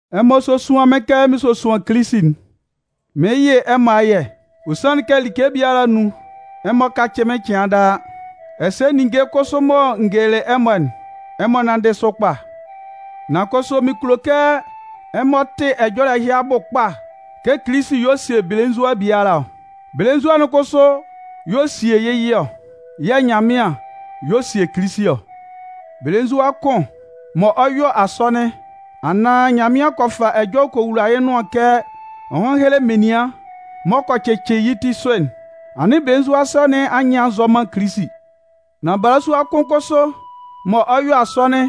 Ɛmɔ sósuan mɩ́n kɛ mɩn sosuan Kilisi'n. Mɩɩn yɩ ɛmɔ ayɛ. Ɔ sanlɩn kɛ like biala anun, ɛmɔ kacɩ mɩ́n cɩan daa, ɛsɛ ninnge kʋsʋ mɔ n gelelɩ ɛmɔ'n, ɛmɔ nánndɩ sʋ kpa. Nan kʋsʋ mɩn kulo kɛ ɛmɔ tɩ ɛjɔlɛ ɛhɩ abʋ kpa kɛ Kilisi y'ɔ sie belenzua biala ɔ. Belenzua'n kʋsʋ y'ɔ sie yɩ́ yɩ ɔ. Yɛ̂ Nyanmɩan y'ɔ sie Kilisi ɔ. Belenzua kʋn mɔ ɔ 'yɔ asɔnɩn, anaan Nyanmɩan kɔ fa ɛjɔlɛ kɔ wula yɩ́ nʋan kɛ ɔ hán héle menian m'ɔ kɔ cɩcɩ yɩ́ ti sʋ'n, anɩn belenzua sɔ nɩn anyɩn a nzɔ man Kilisi. Nan balasua kʋn kʋsʋ mɔ ɔ 'yɔ asɔnɩn,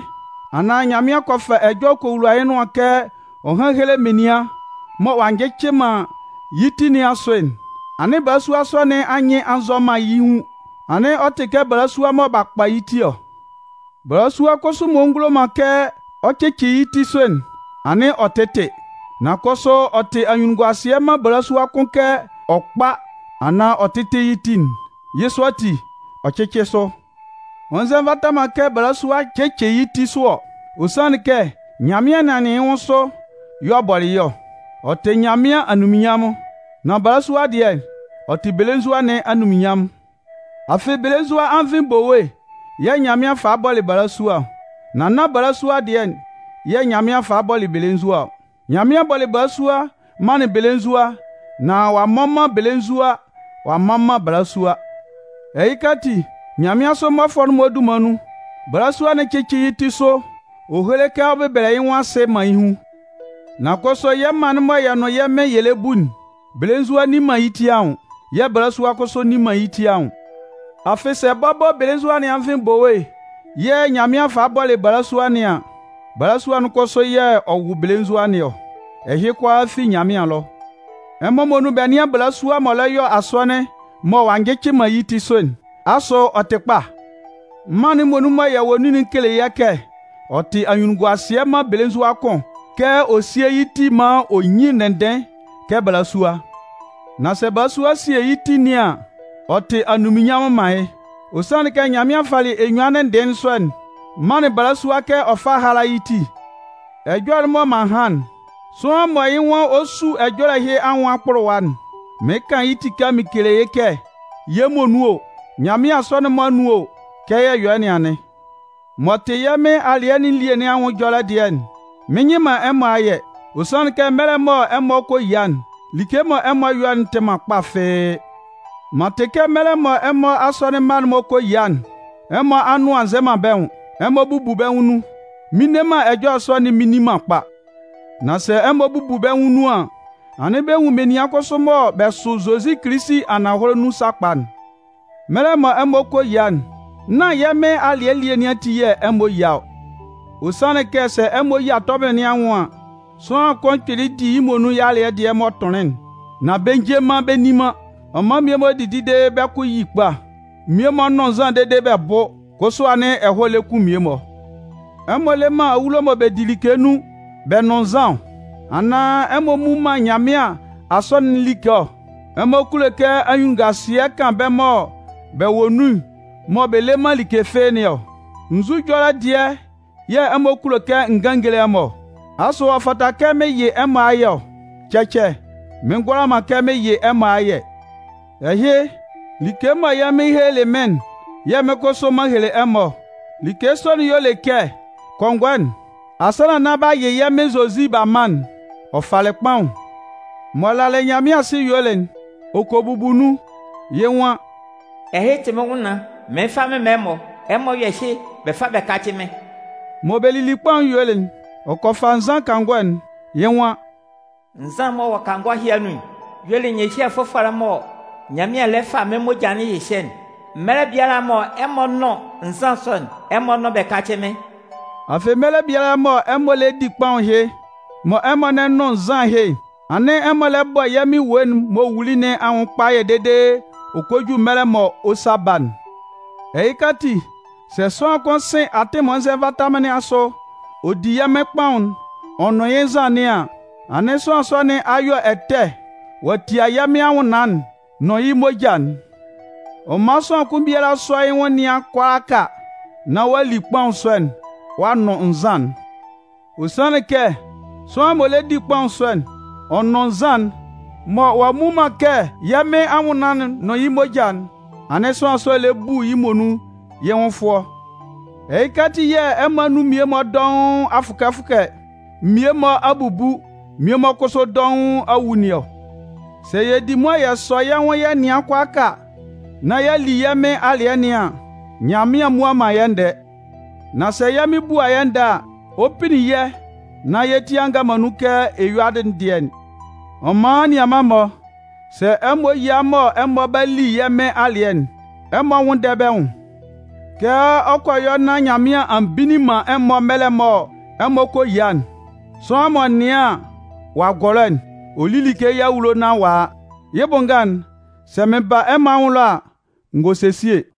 anaan Nyanmɩan kɔ fa ɛjɔlɛ kɔ wula yɩ́ nʋan kɛ ɔ hán héle menian mɔ ɔ'a njɩcɩ man yɩ́ ti nɩn asʋ'n, anɩn balasua sɔ nɩn anyɩn nzɔ man yɩ́ hun. Anɩn ɔ tɩ kɛ balasua mɔ b'a kpa yɩ́ ti ɔ. Balasua kʋsʋ m'ɔ ngulo man kɛ ɔ cɩcɩ yɩ́ ti sʋ'n, anɩn ɔ tɩ́tɩ. Nan kʋsʋ ɔ tɩ anyunnunguasɩɛ man balasua kʋn kɛ ɔ kpá anaan ɔ tɩ́tɩ yɩ́ ti'n. Yɩ́ sɔ ati, ɔ cɩ́cɩ sʋ. Ɔ nzɛ nvata man kɛ belenzua cɩcɩ yɩ́ ti sʋ ɔ. Ɔ sanlɩn kɛ Nyanmɩan nɩanlɩn yɩ́ nwʋn sʋ y'ɔ bɔlɩ yɩ́ ɔ, ɔ tɩ Nyanmɩan anunminnyanmʋn. Nan balasua'n dɩɛ, ɔ tɩ belenzua nɩn anunminnyanmʋn. Afɩ belenzua anvɩn bowe yɛ̂ Nyanmɩan falɩ bɔlɩ balasua ɔ, nan nán balasua'n dɩɛ'n yɛ̂ Nyanmɩan falɩ bɔlɩ belenzua ɔ. Nyanmɩan bɔlɩ balasua manlɩn belenzua nán ɔ'a mmɔ man belenzua ɔ'a mman man balasua. Ɛhɩka ati, nyanmɩansʋ mmɔfʋɛ'n-mɔ dunman nun, balasua'n cɩ́cɩ yɩ́ ti sʋ ɔ héle kɛ ɔ bɛbɛlɛ yɩ́ nwʋn asɩ man yɩ́ hun. Nan kʋsʋ, yɛ́ mân'n mɔ yɛ nʋn yɛ́ Mɩn yɛ lɛ bu'n, belenzua'n nni man yɩ́ ti anwʋn yɛ̂ balasua'n kʋsʋ nni man yɩ́ ti anwʋn. Afɩ sɛ bɔbɔ belenzua nɩn anvɩn bowe yɛ̂ Nyanmɩan falɩ bɔlɩ balasua nɩn an, balasua'n kʋsʋ yɛ̂ ɔ wʋ belenzua nɩn ɔ. Ɛhɩ kʋalaa fi Nyanmɩan ɛlɔ. Ɛmɔ muonun bɛ nɩ́an balasua m'ɔ lɛ yɔ asɔnɩn mɔ ɔ'a njɩcɩ man yɩ́ ti sʋ'n, asʋ ɔ tɩ kpa? Mân'n muonun mɔ yɛ wɔ nun'n kele yɛ́ kɛ, ɔ tɩ anyunnunguasɩɛ man belenzua kʋn kɛ ɔ síe yɩ́ ti'n maan ɔ nyín ndɩnndɩɩn kɛ balasua. Nan sɛ balasua sie yɩ́ ti nɩn an, ɔ tɩ anunminnyanmʋn man yɩ́. Ɔ sanlɩn kɛ Nyanmɩan falɩ enyuan ndɩnndɩɩn sɔ'n manlɩn balasua kɛ ɔ fá hála yɩ́ ti. Ɛjɔlɛ'n mɔ m'an han'n, sʋanlan mɔ yɩ́ nwan ɔ 'su ɛjɔlɛ ɛhɩ anwʋn akpʋlʋwa'n, mɩɩn kan yɩ́ tika mɩn kele yɩ́ kɛ yɛ́ muonun o, Nyanmɩan asɔnɩn'n-mɔ anun o, kɛ yɛ yɔ yɩ́ nɩn anɩn. M'ɔ tɩ yɛ́ Mɩn alɩɛ nɩn elie nɩn anwʋn ɛjɔlɛ dɩɛ'n, mɩn nyɩ man ɛmɔ ayɛ. Ɔ sanlɩn kɛ mɛlɛ mɔ ɛmɔ kɔ yia'n, like mɔ ɛmɔ yɔ'n tɩ man kpa fɩ́ɩ́. M'an tɩ kɛ mɛlɛ mɔ ɛmɔ asɔnɩn mma'n-mɔ kɔ yia'n, ɛmɔ anʋan nzɛ man bɛ́ nwʋn, ɛmɔ bubu bɛ́ nwʋn nun. Mɩn nne man ɛjɔlɛ sɔ'n mɩn nni man kpa. Nan sɛ ɛmɔ bubu bɛ́ nwʋn nun an, anɩn bɛ nwun menian kʋsʋ mɔ bɛ sʋ Zozi Kilisi ananhɔlɛ nun sakpa'n. Mɛlɛ mɔ ɛmɔ kɔ yia'n, nán yɛ́ Mɩn alɩɛ nɩn elie ati yɛ̂ ɛmɔ yia ɔ. Ɔ sanlɩn kɛ sɛ ɛmɔ yia tɔbɩlɩ nɩn anwʋn an, sʋanlan kʋn kpɩlɩ di yɩ́ muonun yɩ́ alɩɛ dɩɛ m'ɔ tʋnlɩn'n, nan bɛ nje man bɛ nni man. Ɔ man mmie-mɔ didi dede bɛ́ kʋ yi kpa. Mmie-mɔ nʋn nzan dede bɛ bʋ, kʋsʋ anɩn ɛhɔɛ lɛ kun mmie-mɔ. Ɛmɔ le man awulo mɔ bɛ di like nun bɛ nʋn nzan ɔ? Anaan ɛmɔ mmu man Nyanmɩan Asɔnɩn'n like ɔ? Ɛmɔ kulo kɛ anyunnunguasɩɛ kan bɛ́ mɔ bɛ wɔ nun mɔ bɛ le man like fɩ́ɩ́ nɩn ɔ? Nzu ɛjɔlɛ dɩɛ yɛ̂ ɛmɔ kulo kɛ n gán n géle ɛmɔ ɔ? Asʋ ɔ fata kɛ mɩn yɩ ɛmɔ ayɛ ɔ? Cɛcɛ! Mɩn ngʋala man kɛ mɩn yɩ ɛmɔ ayɛ! Ɛhɩ, like mɔ yɛ́ Mɩn helelɩ mɩ́n'n yɛ̂ mɩ́n kʋsʋ m'an hele ɛmɔ ɔ. Like sɔ'n y'ɔ le kɛ kɔngɔɛ'n, asannan nán b'a yɩ yɛ́ Mɩn Zozi b'a man'n, ɔ falɩ kpaʋn. M'ɔ lalɩ Nyanmɩan asɩ yuelɩ'n, ɔ kɔ bubu nun. Yɩ́ nwan: “Ɛhɩ tɩ mɩ́n nwʋnnaan, mɩɩn fa mɩn man ɛmɔ. Ɛmɔ yɔ́ ɛhɩ bɛ fá bɛ kácɩ mɩ́n.” Mɔ bɛ lili kpaʋn'n yuelɩ'n, ɔ kɔ fa nzan kangɔ'n. Yɩ́ nwan: “Nzan'n m'ɔ wɔ kangɔ ɛhɩ anun'n y'ɔ le nyɩhyɛ fʋfɔlɛ'n mɔ Nyanmɩan lɛ fa mɩ́n moja'n hyɩhyɛ'n. Mɛlɛ biala mɔ ɛmɔ 'nʋn nzan sɔ'n, ɛmɔ nʋ́n bɛ kácɩ mɩ́n.” Afɩ mɛlɛ biala mɔ ɛmɔ lɛ di kpaʋn ɛhɩ, mɔ ɛmɔ lɛ nʋn nzan ɛhɩ'n, anɩn ɛmɔ lɛ bɔ yɛ́ Mɩn ewue'n m'ɔ wuli nɩn anwʋn kpayɛ dede ɔ kɔ ju mɛlɛ mɔ ɔ 'sa ba'n. Ɛhɩka ati, sɛ sʋanlan kʋn sɩn atɩn m'ɔ nzɛ nvata man nɩn asʋ ɔ di yɛ́ Mɩn kpaʋn'n ɔ nʋn yɩ́ nzan nɩn an, anɩn sʋanlan sɔ nɩn a yɔ ɛtɛ ɔ'a tia yɛ́ Mɩn anwʋnnaan'n nʋn yɩ́ moja'n. Ɔ man sʋanlan kʋn biala sɔ́ yɩ́ nwʋn nɩ́an kʋalaaka nán ɔ'a li kpaʋn sɔ'n ɔ'a nʋn nzan'n. Ɔ sanlɩn kɛ sʋanlan m'ɔ lɛ di kpaʋn sɔ'n ɔ nʋn nzan'n mɔ ɔ'a mmu man kɛ yɛ́ Mɩn anwʋnnaan'n nʋn yɩ́ moja'n, anɩn sʋanlan sɔ'n lɛ bu yɩ́ muonun yɩ́ nwʋn fʋɔ. Ɛhɩka ati yɛ̂ ɛmɔ anun mmie-mɔ dɔʋn a fʋkɛ fʋkɛ, mmie-mɔ a bubu, mmie-mɔ kʋsʋ dɔʋn a wu nɩn ɔ. Sɛ yɛ di mʋa yɛ sɔ yɛ́ nwʋn yɛ nɩan kʋalaaka nán y'a li yɛ́ Mɩn alɩɛ nɩn an, Nyanmɩan mmua man yɛ́ ndɛɛ. Nan sɛ yɛ́ Mɩn bua yɛ́ ndɛɛ a, ɔ 'pinnin yɛ́ nán yɛ́ ti a nga man nun kɛ ɛyuadɩ'n dɩɛ'n. Ɔ man anianman-mɔ, sɛ ɛmɔ yia mɔ ɛmɔ 'ba li yɛ́ Mɩn alɩɛ'n, ɛmɔ nwʋ́nndɛ bɛ́ nwʋn. Kɛ ɔ kɔ yɔ nán Nyanmɩan a mbinnin man ɛmɔ mɛlɛ mɔ ɛmɔ kɔ yia'n, sʋanlan m'ɔ nɩan an, ɔ'a gɔlɔ'n, ɔ lí like yɩ́ awulo nán ɔ'a a. Yɩ́ bʋ nga'n, sɛ mɩn ba ɛmɔ anwʋn ɛlɔ a, n gɔ sesie.